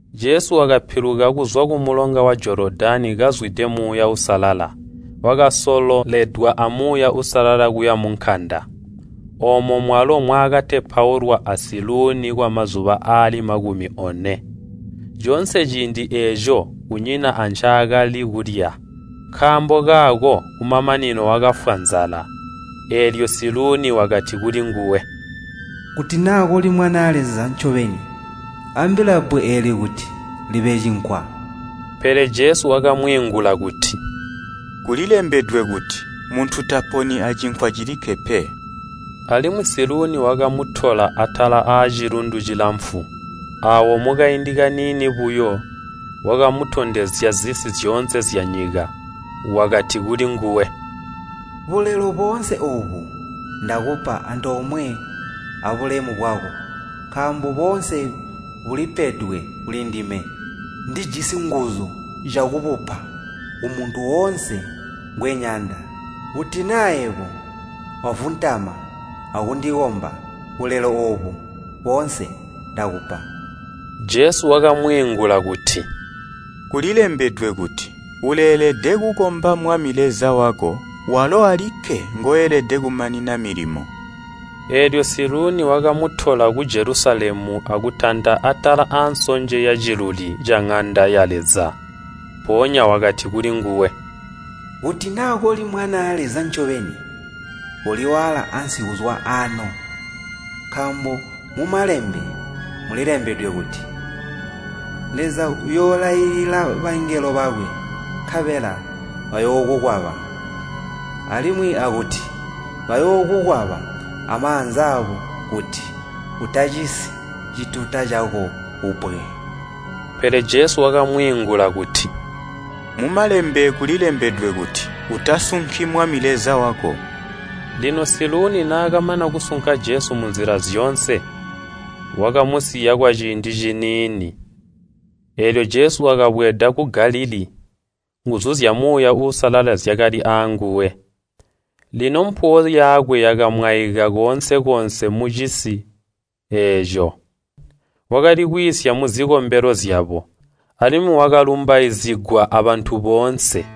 Jesu wakapiluka kuzwa kumulonga wa Jolodani kazwide Muuya Uusalala, wakasololedwa a Muuya Uusalala kuya munkanda. Oomo mwalo mwakaakutepaulwa a Siluuni kwamazuba aali makumi one. Coonse ciindi eeco kunyina ancaakali kulya, nkaambo kaako kumamanino wakafwa nzala. Eelyo Siluuni wakati kulinguwe, “Kuti naa koli Mwanaa Leza ncobeni, ambila bbwe eeli kuti libe cinkwa.” Pele Jesu wakamwiingula kuti, “Kulilembedwe kuti, ‘Muntu taponi acinkwa cilikke pe.’” Alimwi Siluuni wakamutola atala aacilundu cilamfu, aawo mukaindi kaniini buyo, wakamutondezya zisi zyoonse zyaanyika. Wakati kulinguwe, “Bulelo boonse oobu ndakupa antoomwe abulemu bwabo, nkaambo boonse bulipedwe kulindime. Ndijisi nguzu zyakubupa kumuntu woonse ngweyanda. Kuti naa yebo wavuntama akundikomba, bulelo oobu boonse ndakupa.” Jesu wakamwiingula kuti, “Kulilembedwe kuti, ‘Uleelede kukomba Mwami Leza wako, walo alikke ngoelede kumanina milimo!’” Eelyo Siluuni wakamutola ku Jelusalemu akutanta atala ansonje yaciluli caŋanda ya Leza. Mpoonya wakati kulinguwe, “Kuti naa koli Mwanaa Leza ncobeni, koliwaala ansi kuzwa aano, nkaambo mu Malembe mulilembedwe kuti, ‘Leza uyoolailila bangelo bakwe nkabela bayookukwaba.’ Alimwi akuti, ‘Bayookukwaba amaanza aabo kuti utacisi cituta cako kubbwe.’” Pele Jesu wakamwiingula kuti, “Mu Malembe kulilembedwe kuti, ‘Utasunki Mwami Leza wako.’” Lino Siluuni naakamana kusunka Jesu munzila zyoonse, wakamusiya kwaciindi ciniini. Eelyo Jesu wakabweeda ku Galilii, nguzu zya Muuya Uusalala zyakali aanguwe. Lino mpuwo yakwe yakamwaika koonse-koonse mucisi eeco. Wakali kwiisya muzikombelo zyabo, alimwi wakalumbaizigwa abantu boonse.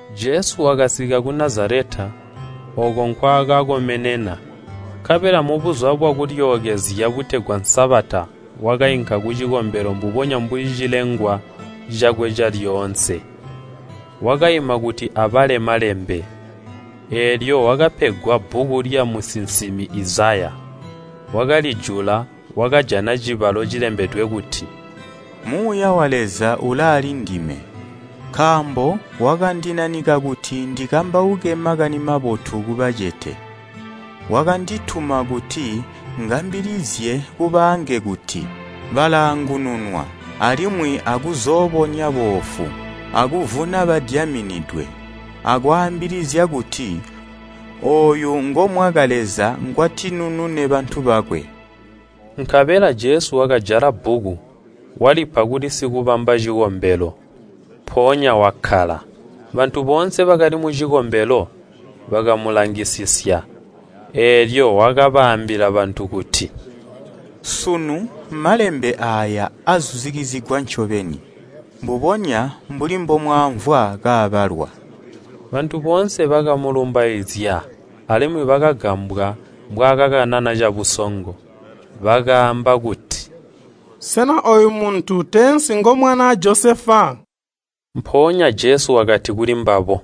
Jesu wakasika ku Nazaleta, ooko nkwaakakomenena, nkabela mu Buzuba bwa Kulyookezya butegwa Sabata wakainka kucikombelo mbubonya mbuli cilengwa cakwe calyoonse. Wakaima kuti abale Malembe, eelyo wakapegwa bbuku lyamusinsimi Izaya. Wakalijula, wakajana cibalo cilembedwe kuti, “Muuya wa Leza ulaalindime, nkaambo wakandinanika kuti ndikambauke Makani Mabotu kubacete. Wakandituma kuti ngambilizye kubaange kuti, balaangununwa, alimwi akuzoobonya boofu, akuvuna badyaminidwe, akwaambilizya kuti, ‘Ooyu ngomwaka Leza ngwatinunune bantu bakwe.’” Nkabela Jesu wakajala bbuku, walipa kuli sikubamba cikombelo, mpoonya wakkala. Bantu boonse bakali mucikombelo bakamulangisisya. Eelyo wakaambila bantu kuti, “Sunu Malembe aaya acitika ncobeni, mbubonya mbuli mbomwaamvwa kaabalwa.” Bantu boonse bakamulumbaizya, alimwi bakagambwa mbwaakakanana cabusongo. Bakaamba kuti, “Sena ooyu muntu teensi ngomwanaa Josefa?” Mpoonya Jesu wakati kulimbabo,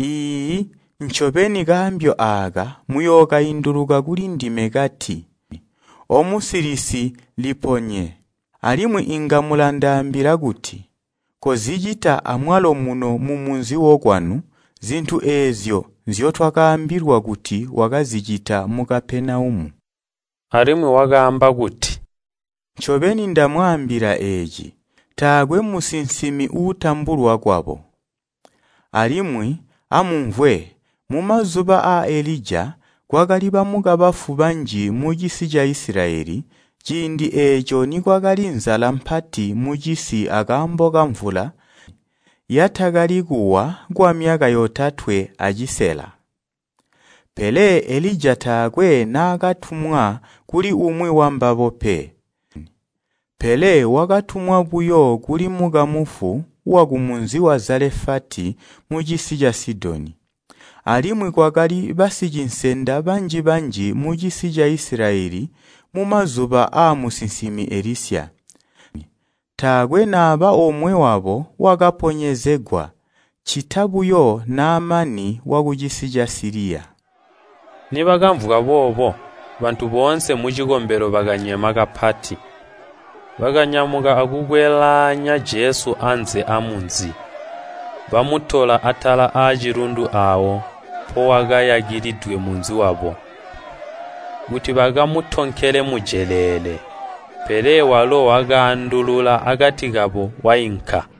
“Iiyi, ncobeni kambyo aaka muyookainduluka kulindime kati, ‘Omusilisi, liponye.’ Alimwe inga mulandaambila kuti, ‘Kozicita amwalo muno mumunzi wokwanu zintu eezyo nzyotwakaambilwa kuti wakazicita mu Kapenaumu.’” Alimwi wakaamba kuti, “Ncobeni ndamwaambila eeci, taakwe musinsimi uutambulwa kwabo. Alimwi amumvwe, mumazuba aa Elija kwakali bamukabafu banji mucisi ca Isilayeli ciindi eeco nikwakali nzala mpati mucisi akaambo kamvula yatakali kuwa kwamyaka yotatwe acisela. Pele Elija taakwe naakatumwa kuli umwi wambabo pe, pele wakatumwa buyo kuli mukamufu wakumunzi wa Zelafati mucisi ca Sidoni. Alimwi kwakali basicinsenda banji-banji mucisi ca Isilayeli mumazuba aamusinsimi Elisya. Taakwe naba omwe wabo wakaponyezegwa, ccita buyo Naamani wakucisi ca Siliya.” Nibakamvwa boobo, bantu boonse mucikombelo bakanyema kapati. Bakanyamuka akukwelaanya Jesu anze aamunzi, bamutola atala acilundu aawo mpowakayakilidwe munzi wabo, kuti bakamutonkele mujeleele. Pele walo wakaandulula akati kabo wainka.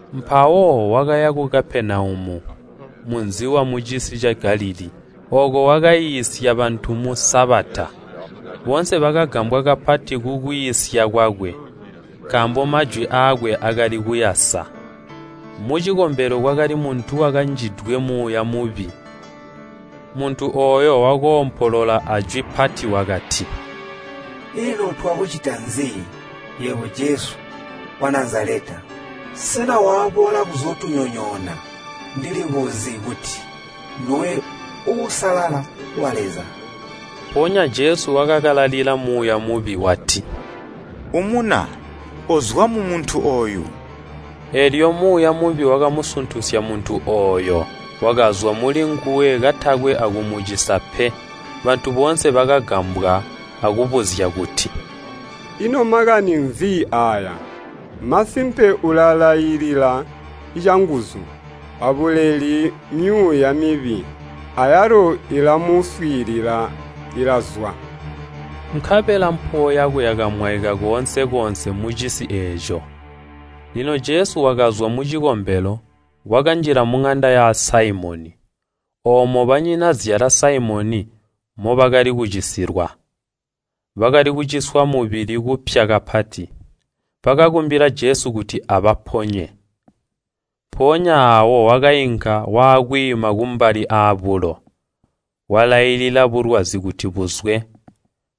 Mpawo wakaya ku Kapenaumu, munzi wamucisi ca Galilii, ooko wakaiisya bantu mu Sabata. Boonse bakagambwa kapati kukwiisya kwakwe, nkaambo majwi aakwe akali kuyasa. Mucikombelo kwakali muntu wakanjidwe muuya mubi. Muntu ooyo wakoompolola ajwi pati wakati, “Ino twakucita nzi, yebo Jesu wa Nazaleta? Sena waboola kuzootunyonyoona? Ndilikuzi kuti nduwe Uusalala wa Leza.” Mpoonya Jesu wakakalalila muuya mubi, wati, “Umuna, kozwa mumuntu ooyu!” Eelyo muuya mubi wakamusuntusya muntu ooyo, wakazwa mulinguwe kaatakwe akumucisa pe. Bantu boonse bakagambwa akubuzya kuti “Ino makani nzi aaya? Masimpe ulalailila canguzu a buleli myuuya mibi, ayalo ilamuswiilila ilazwa!” Nkabela mpuwo yakwe yakamwaika koonse-koonse mucisi eeco. Lino Jesu wakazwa mucikombelo, wakanjila muŋanda ya Saimoni. Oomo banyinazyala Saimoni mobakali kucisilwa. Bakali kuciswa mubili kupya kapati. Bakakumbila Jesu kuti abaponye. Mpoonya aawo wakainka wakwiima kumbali aabulo, walailila bulwazi kuti buzwe.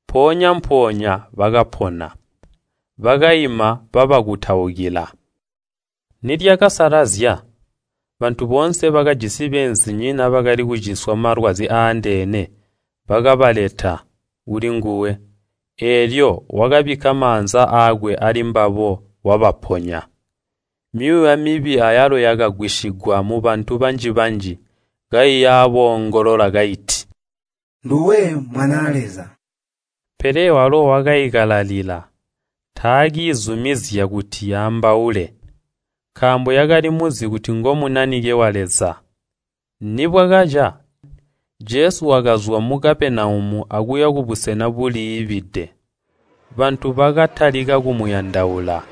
Mpoonya-mpoonya bakapona, bakaima babakutaukila. Nilyakasalazya, bantu boonse bakajisi beenzinyina bakali kuciswa malwazi aandeene, bakabaleta kulinguwe, eelyo wakabikka maanza aakwe alimbabo wabaponya. Myuuya mibi ayalo yakagwisigwa mubantu banji-banji, kaiyaboongolola kaiti, “Nduwe Mwanaa Leza!” Pele walo wakaikalalila, taakiizumizya kuti yaambaule, nkaambo yakali muzi kuti ngo Munanike wa Leza. Nibwakaca, Jesu wakazwa mu Kapenaumu akuya kubusena buliibide. Bantu bakatalika kumuyandaula,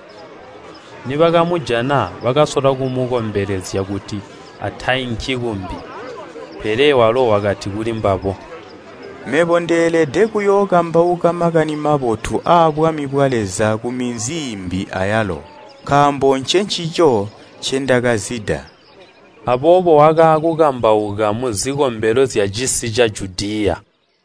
nibakamujana bakasola kumukombelezya kuti atainki kumbi. Pele walo wakati kulimbabo, “Mebo ndeelede kuyookambauka Makani Mabotu aabwami bwa Leza kuminzi iimbi ayalo, nkaambo ncencico ncindakazida.” Aboobo wakaakukambauka muzikombelo zyacisi ca Judiya.